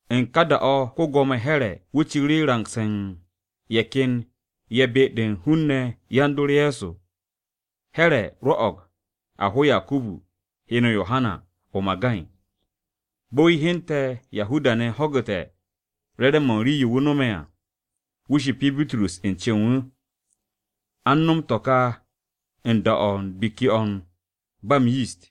U̱n ka da-o̱ ko-Gwo̱mo Here̱ [Agirippa] wu̱ ciru̱ rangse̱ u̱n ye̱ ken ye̱ be-de u̱n hun-ne̱ yan-dor Ye̱so. Here̱ rwo̱'o̱g a ho Yakubu, (heno Yohana), o-magay. Bo̱ wu̱ hyente̱ Yahuda-ne̱ ho̱gu̱te̱ re̱re̱m-mo̱ u̱n rii-yo wu̱ no̱me̱ à, wu̱ shipi Bitrus u̱n cen wu̱. A u̱n no̱m to̱ ka u̱n da-o̱ u̱n Biki-o̱ u̱t-Buro̱di to̱ ba m-Yist.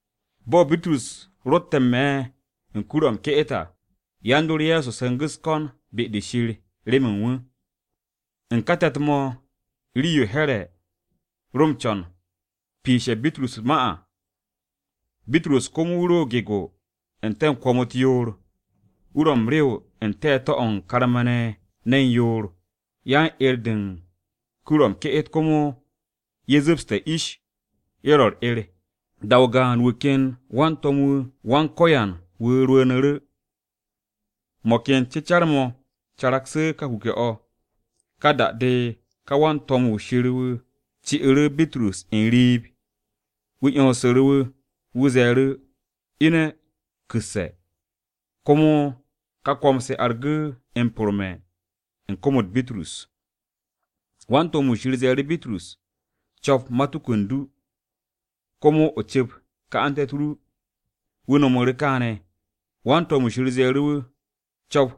Bo̱ Bitrus rotte̱ n-me̱ u̱n kur-o̱ m-ke'et à, yan-dor Ye̱so se̱ngu̱ u̱s-ko̱n be-de Shir remen wu̱. U̱n ka te̱t-mo̱ rii-yo Here̱ piishite̱ Bitrus u̱t-ma, Bitrus komo wu̱ ro gego n-te̱ kwo̱m-u̱t yoor. Wu̱ ro m-rew n-te̱te̱ o̱ u̱n karma-ne̱ ne̱n yoor. Yan-'er-de u̱n kur-o̱ m-ke'et komo ye̱ zu̱pste̱ ish ye̱ ro u̱r-'er. Da-o gaan, wu̱ ken wan-to̱m-wu̱ Wan-Ko̱yan wu̱ rwu̱u̱nu̱ru̱, mo̱ ken cecar-mo̱ caraksu̱ ka kuke̱-o̱. Ka da-de ka wan-to̱m-wu̱ Shir wu̱ ci'u̱ru̱ Bitrus n-riib wu̱ 'yonsu̱ru̱ wu̱. Wu̱ ze̱e̱ru̱, “Ine̱ ku̱sse̱.” Komo ka kwo̱m-to̱ argu̱ m-porme̱ u̱n kom-u̱t Bitrus. Wan-to̱m-wu̱ Shir ze̱e̱ru̱ Bitrus, “Co̱p matuku u̱n du, komo o cu̱p ka'ante̱-u̱t ru.” Wu̱ nomu̱ru̱ kaane̱. Wan-to̱m-wu̱ Shir ze̱e̱ru̱ wu̱, “Yap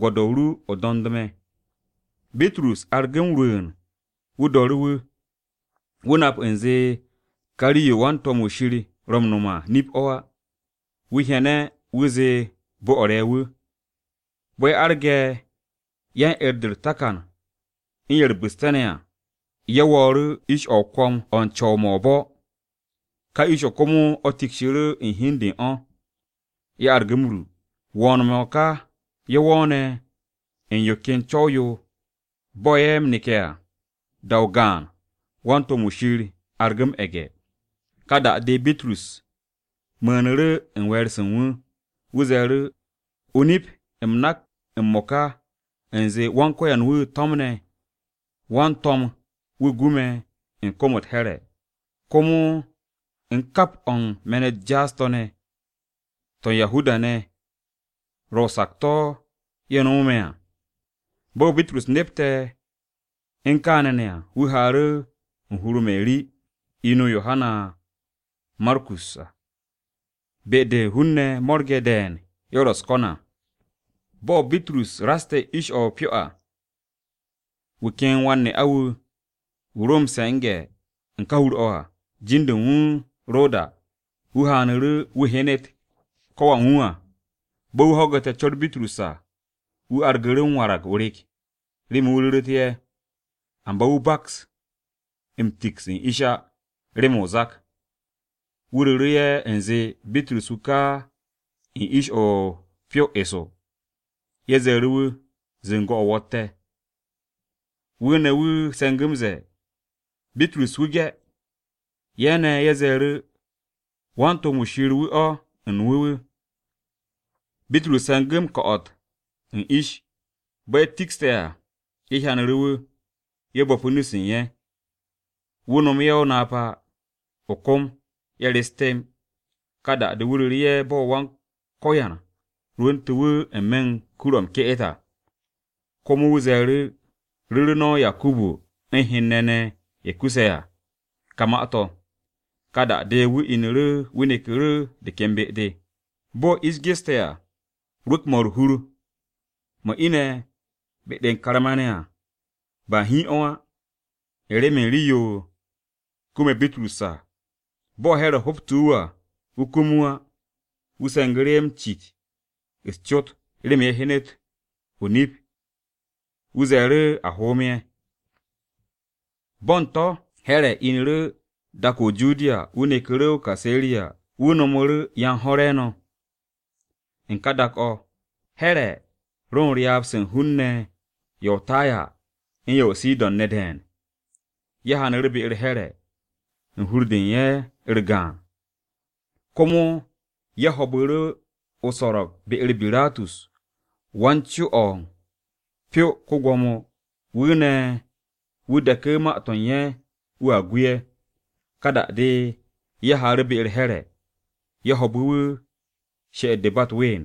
gwo̱do̱-o ru, o do̱nd me̱.” Bitrus argu̱ m-rwu̱u̱n wu̱ do̱ru̱ wu̱. Wu̱ nap u̱nze ka rii-yo wan-to̱m-wu̱ Shir ro m-no̱m à, nip-o̱ á, wu̱ hyene̱ wu̱ zee bo-o̱ re̱ wu̱. Bo̱ ye̱ arge̱ yan-'er-de ye̱ u̱r-takan u̱n ye̱ u̱r-bu̱ste̱ ne̱ à, ye̱ wo̱o̱ru̱ ish-o̱ o-kwo̱m o̱ u̱n co̱w-mo̱ o-bo̱. Ka ish-o̱ komo o̱ tikshiru̱ u̱n hi u̱n de u̱n o̱. Ye̱ argu̱ m-ru. Wo̱o̱n-mo̱ ka ye̱ wo̱o̱ne̱ u̱n yo ken co̱w-yo bo̱ ye̱ ro m-neke̱ à, da-o gaan wan-to̱m-wu̱ Shir argu̱ m-e̱ge̱. Ka da-de Bitrus mu̱u̱nu̱ru̱ u̱n we̱e̱r-se u̱n wu̱. Wu̱ ze̱e̱ru̱, “O-nip, m-mo̱ka u̱m nak u̱nze Wan-Ko̱yan-wu̱ to̱mne̱ wan-to̱m-wu̱ gu me̱ u̱n kom-u̱t Here̱, komo u̱n kap o̱ u̱n me̱n-u̱t jaas-to̱ ne̱, to̱ Yahuda-ne̱ ro̱ o-sakto̱ ye̱ nomotu̱ me̱ à.” Bo̱ Bitrus nepte̱ u̱n kaane̱ ne̱ à, wu̱ haaru̱ u̱n hur-o Meri, inu Yohana Markus, be-de hun-ne̱ mo̱rge̱ de̱e̱n ye̱ ro u̱s-ko̱n à. Bo̱ Bitrus raste̱ ish-o̱ u̱n pyo à, wu̱ ken wan-ne'a-wu̱, wu̱ ro m-se̱nge̱ u̱n ka hur-o̱ à, jin-de u̱n wu̱ Roda wu̱ haanu̱ru̱ wu̱ hyenet ko̱ wan wu̱ à. Bo̱ wu̱ ho̱gu̱te̱ co̱r Bitrus à, wu̱ wargu̱ru̱ n-me̱ o-rek remen wu̱ ru̱ru̱te̱ ye̱. Amba wu̱ baks m-tiks u̱n ish á remen o-zak. Wu̱ ru̱ru̱ ye̱ u̱nze Bitrus wu̱ ka u̱n ish-o̱ u̱n pyo eso. Ye̱ ze̱e̱ru̱ wu̱, “Zu̱ngo̱-o̱ wo̱tte̱!” Wu̱ ne̱ wu̱ se̱ngu̱ m-ze̱e̱, “Bitrus wu̱ ge̱.” Ye̱ ne̱ ye̱ ze̱e̱ru̱, “Wan-to̱m-wu̱ Shir-wu̱ u̱n wu̱ wu̱ o̱!” Bitrus se̱ngu̱ m-ko̱'o̱t u̱n ish. Bo̱ ye̱ tikshte̱ à, ye̱ hyanu̱ru̱ wu̱, ye̱ bo̱pu̱ nu-se u̱n ye̱. Wu̱ nomu̱ ye̱ o-napa o-kom ye̱ rest temb. Ka da-de wu̱ ru̱ru̱ ye̱ bo̱ Wan-Ko̱yan rwu̱ntu̱ wu̱ n-me̱ u̱n kur-o̱ m-ke'et à. Komo wu̱ ze̱e̱ru̱, “Ru̱ru̱ no̱ Yakubu u̱n hen-ne̱ ne̱ ye̱ kuse̱ à ka ma-to̱.” Ka da-de wu̱ inu̱ru̱ wu̱ neku̱ru̱ de ken be-de. Bo̱ ish geste̱ à, rwu̱k-mo̱ u̱r-hur mo̱ ine̱ be-de u̱n karma-ne̱ à, ba hiin o̱ á, u̱n remen rii-yo kume̱ Bitrus à. Bo̱ Here̱ ho̱btu̱ wu̱ à, wu̱ kum wu̱ á. Wu̱ se̱ngu̱ru̱ ye̱ m-cit u̱s-cot remen wu̱ hyenet o-nip, wu̱ ze̱e̱ru̱ a hoom ye̱. Bo̱ u̱n to̱ Here̱ inu̱ru̱ dak-o̱ o-Judiya, wu̱ neku̱ru̱ o-Kaseriya, wu̱ no̱mu̱ru̱ yan-ho̱ re̱e̱no̱. U̱n ka da-o̱, Here̱ ro u̱n ryaab-se u̱n hun-ne̱ ye̱ o-Taya u̱n ye̱ o-Sidon ne̱ de̱e̱n. Ye̱ haanu̱ru̱ be-u̱r Here̱ u̱n hur-de u̱n ye̱ u̱r-gaan, komo ye̱ ho̱o̱bu̱ru̱ o-so̱ro̱g be-u̱r Birastus wan-co-o̱ pyo-o ko-Gwo̱mo, wu̱ ne̱ wu̱ deku̱ ma-to̱ u̱n ye̱ wu̱a gu ye̱. Ka da-de ye̱ haaru̱ be-u̱r Here̱, ye̱ ho̱o̱bu̱ wu̱ she'et-de ba u̱t-ween,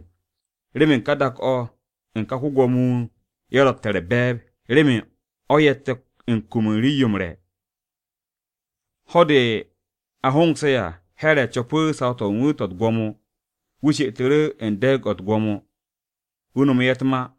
remen dak-o̱ u̱n ka ko-Gwo̱mo-wu̱ ye̱ rotte̱ u̱r-be̱e̱b, remen o̱ ye̱tte̱ u̱n kum u̱n rii-yo m-re̱. Ho̱-de a hongse̱ à, Here̱ co̱pu̱ saw-to̱ u̱n wu̱ to̱ u̱t-gwo̱mo, wu̱ she'etu̱ru̱ u̱n de̱e̱g-o̱ u̱t-gwo̱mo, wu̱ nomu̱ ye̱ u̱t-ma.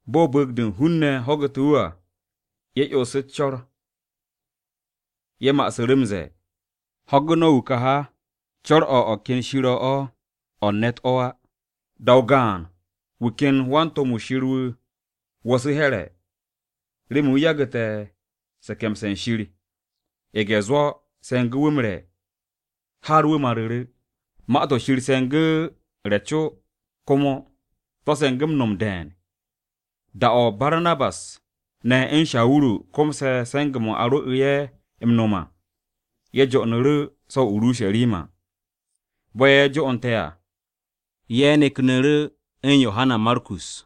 Bo̱ bu̱u̱g-de hun-ne̱ ho̱gu̱te̱ wu̱ à, ye̱ 'yonsu̱ u̱s-co̱r. Ye̱ ma'asu̱ru̱ m-ze̱e̱, “Ho̱gu̱ no̱ wu̱ ka ha! Co̱r-o̱ u̱n o̱ ken shir-o̱ o̱, o̱ u̱n ne̱t o̱ á!” Da-o gaan, wu̱ ken wan-to̱m-wu̱ Wan-Ko̱yan wu̱ wo̱su̱ Here̱, remen wu̱ yagu̱te̱ se̱ke̱mse̱ u̱n Shir. Ye̱ge̱-zwo̱ se̱ngu̱ wu̱ m-re̱ har wu̱ maru̱ru̱. Ma-to̱ Shir se̱ngu̱ re̱ co komo, to̱ se̱ngu̱ m-no̱m de̱e̱n. Da-o̱ Barnabas ne̱ u̱n Shawuru komse̱ se̱nge̱-mo̱ a rwo̱'u̱ ye̱ m-no̱m à, ye̱ jo'onu̱ru̱ so̱ o-Urusharima. Bo̱ ye̱ jo'onte̱ à, ye̱ neknu̱ru̱ u̱n Yohana Markus.